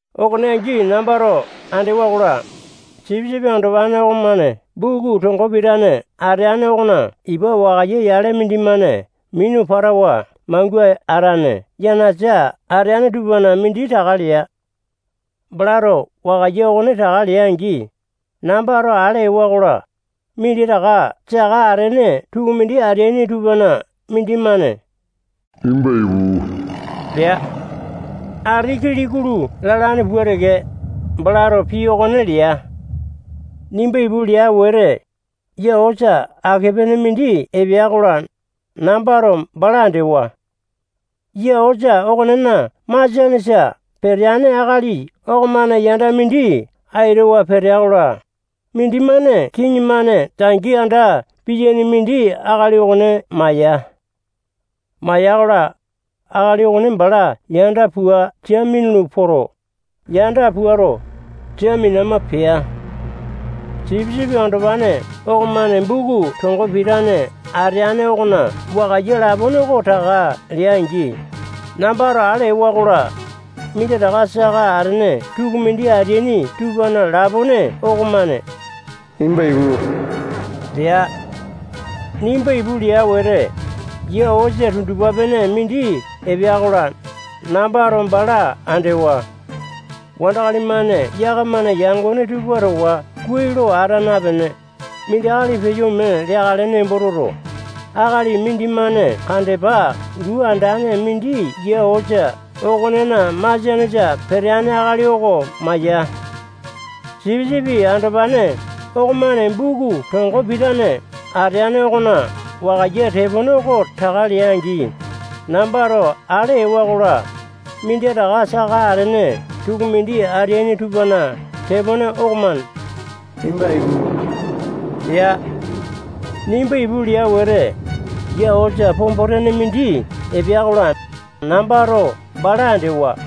Okone angi nambato andewa-kola, sipisipi andopane okomane buku tongo pitane ateane okona ipa wakaiya yale mindimane minu patawa mangua atane yanasa ateane tupana mindi taka lea. Balato wakaiya okone taka lea-angi, nambato ale ewa-kola, minditaka saka atene tukumindi ateaini tupana mindimane nimba ipu lea. Ati kili-kulu lalane pua teke, balato pii okone lea. Nimba ipu lea wete, yia osa ake-pene mindi epea-kola, nambato bala andewa. Yia osa okonena masianesa peteane akali okomane yanda mindi aitawa petea-kola, mindimane kiŋi-mane tangi anda piyaini mindi akali okone maya. Maya-kola, akali okone bala yanda pua sia minulu poto, yanda puato, sia minama pea. Sipisipi Andopane okomane buku tongo pitane ateane okona wakaiya lapone oko taka lea-angi, nambato ale ewa-kola, minditaka saka atene tukumindi ateaini tupana lapone okomane nimba ipu lea. Nimba ipu lea wete, yia osa tundupa-pene mindi epea-kola, nambato bala andewa. Wandakali-mane yakamana yangone tupa towa kuai lo ata napene, mindi akali peyo ome leakale nembo toto, akali mindimane kandepa luu andane mindi yia osa okonena masianesa peteane akali oko maya. Sipisipi Andopane okomane buku tongo pitane ateane okona wakaiya tepone oko taka lea-angi, nambato ale ewa-kola, minditaka saka atene tukumindi ateaini tupana tepone okomane nimba ipu lea. Nimba ipu lea wete, yia osa pombo-tene mindi epea-kola, nambato bala andewa.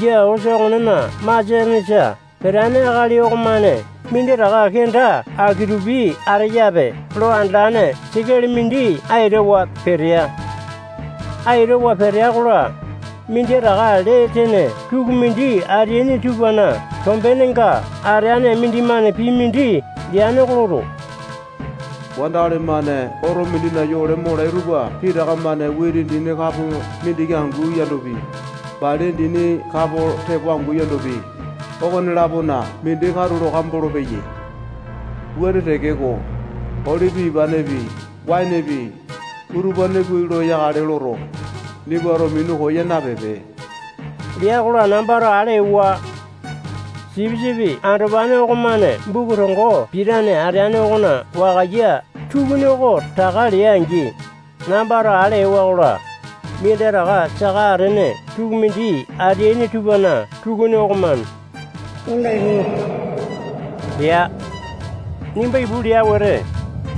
Yia osa okonena masianesa peteane akali okomane minditaka kenda aki-tupi ateyape lo andalane sekele mindi aitawa petea. Aitawa petea-kola, minditaka lee tene tukumindi ateaini tupana tombenenga ateane mindimane pii mindi leane oko loto, wandakali-mane oto mindina yole molai tupa pitaka-mane witi dini kapo mindiki angu yandopi, bali dini kapo tepo angu yandopi, okone-lapona mindi katulo kambolo-peyai. Wuane tekeko, olipi ipanepi, waenepi, utupane kuai lo yakale loto, nimbato minu koya napipe lea-kola, nambato ale ewa. Sipisipi Andopane okomane buku tongo pitane ateane okona wakaiya tukuni oko taka lea-angi, nambato ale ewa-kola, minditaka saka atene tukumindi ateaini tupana tukuni okomane nimba ipu lea. Nimba ipu lea wete,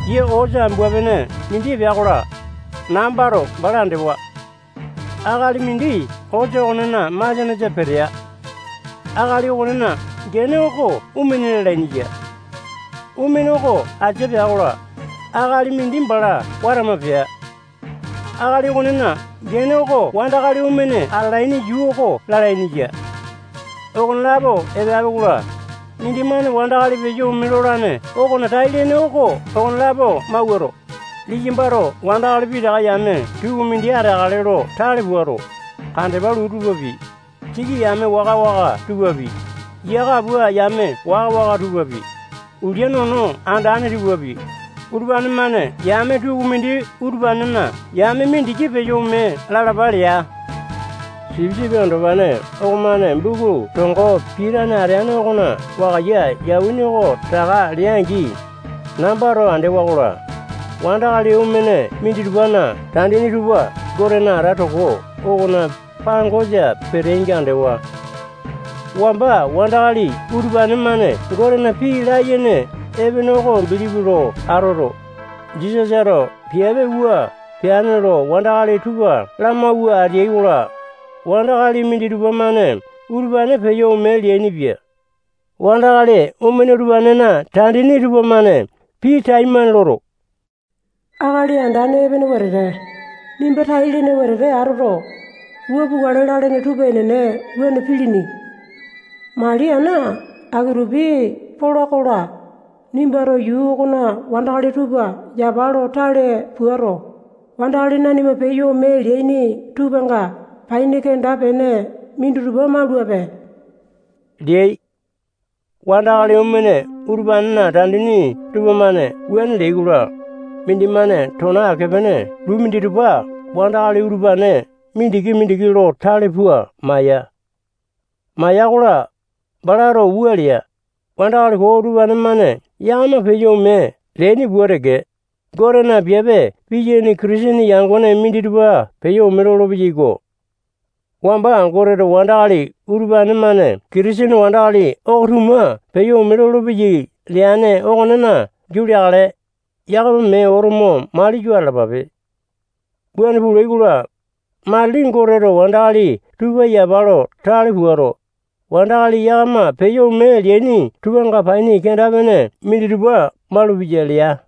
yia osa ambua-pene mindi epea-kola, nambato bala andewa. Akali mindi osa okonena masianesa petea. Akali okonena gene oko Omene lalaini ya. Omene oko asini pea-kola, akali mindi bala watama pea. Akali okonena gene oko wandakali omene atalaini yuu oko lalaini ya. Okonelapo epeapi-kola, mindimane wandakali peyo ome lolane okona tai-lene oko okonelapo mawuato, liyambato wandakali pitaka yame tukumindi ateakale lo tale puato, kandepa luu tupapi, siki yame waka-waka tupapi, yia kapua yame waka-waka tupapi, ulia nono andane tupapi, utupane-mane yame tukumindi utupanena yame mindiki peyo ome lalapa lea. Sipisipi Andopane okomane buku tongo pitane ateane okona wakaiya yauwini oko taka lea-angi, nambato andewa-kola, wandakali omene minditupana tandini tupa Gotena alata toko okona pangosa peteainga andewa. Wamba wandakali utupane-mane Gotena pii layene epene oko bilipi lo atoto, Jisasato piape wua peane lo wandakali tupa lamauwa ateai-kola, wandakali minditupa-mane utupane peyo ome leainipia. Wandakali omene utupanena tandini tupamane pii taimane loto, Akali Andane epene wetete, nimba tai-lene wetete atoto, wua pukale lalene tupa enene wuane pilini. Mali ana aki-tupi pola-kola, nimbato yuu okona wandakali tupa yapa lo tale puato, wandakali nanima peyo ome leaini tupanga paini kenda-pene minditupa maulape leai. Wandakali omene utupanena tandini tupamane wuane leai-kola, mindimane tona ake-pene luu minditupa wandakali utupane mindiki-mindiki lo tale pua maya. Maya-kola, balato wua lea: Wandakali koo utupane-mane yakama peyo ome leaini pua teke, Gotena piape piyaini Kitisene yangone minditupa peyo ome lolo-peyaiko. Wamba Goteto wandakali utupane-mane Kitisene wandakali oko-tuma peyo ome lolopeyai leane okonena giau leakale, yakama mee oto mo mali yo atalapape. Wuane pulai-kola, matili Goteto wandakali tupa yapa lo tale puato, wandakali yakama peyo ome leaini tupanga paini kenda-pene minditupa malupeya lea.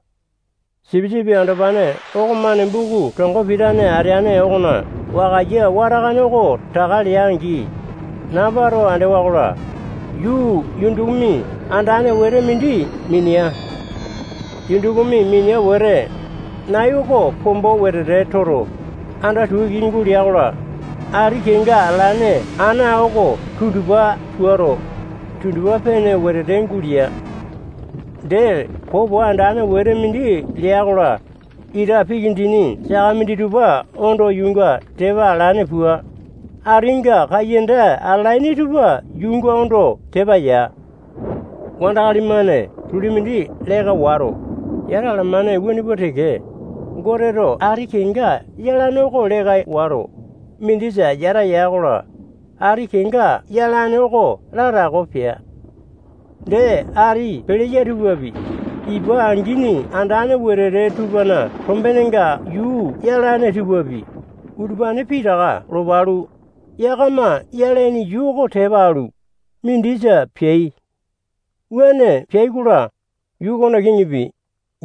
Sipisipi Andopane okomane buku tongo pitane ateane okona wakaiya watakane oko taka lea-angi, nambato andewa-kola, yuu yundukumi andane wetete mindi minea. Yundukumi minea wete, nai oko pombo wetete toto, anda tua iki gulea-kola, ati kenga atalane ana oko tundupa puato, tundupa-pene wetete gulea. Dee, popo andane wete mindi leya-kola, ita piki dini saka minditupa ondo yuunga tepa alane pua, atinga kaiyanda atalaini tupa yuunga ondo tepa ya. Wandakali-mane tuli mindi leka wato, yata alamane wuane pua teke, Goteto ati kenga yalane oko leka wato, mindisa yata ya-kola, ati kenga yalane oko latako pea. Dee, ati peleya tupapi, ipa angini andane wetete tupana tombenenga yuu yalane tupapi, utupane pitaka lopa alu, yakama yalaini yuu oko tepa alu, mindisa peai. Wuane peai-kola, yuu okona kiŋipi,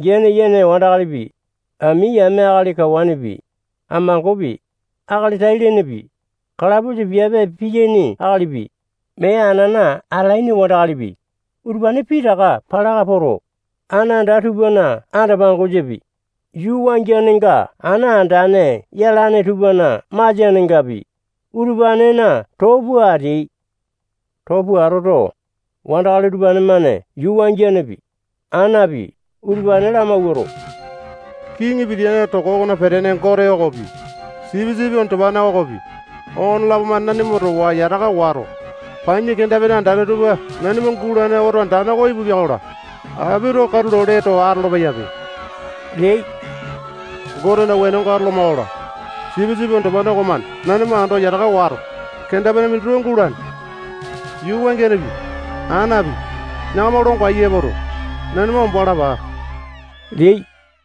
gene yene wandakalipi, ami yame akali kawanepi, amangopi, akali tai-lenepi, katapusa piape piyaini akalipi, mee anana atalaini wandakalipi, utupane pitaka palaka poto, ana anda tupana anda-pangosapi, yuu wangianenga ana andane yalane tupana masianengapi, utupanena too pua ateai. Too pua atoto, wandakali utupane-mane yuu wangianepi, anapi, utupane lamawuato, kiŋi pitiyane toko okona petene Gote okopi, Sipisipi Andopane okopi, okonelapo-mane nanima towa yataka wato, paini kenda-pene andane tupa nanima gulane oto andane oko ipupia-kola, apito katulo lee too atolo-peyape leai. Gotena wenonga atoloma-kola, Sipisipi Andopane okomane nanima ando yataka wato, kenda-pene minditupa gulane. Yuu wangianepi, anapi, yakama longo aiya epoto, nanima ombo alapa leai.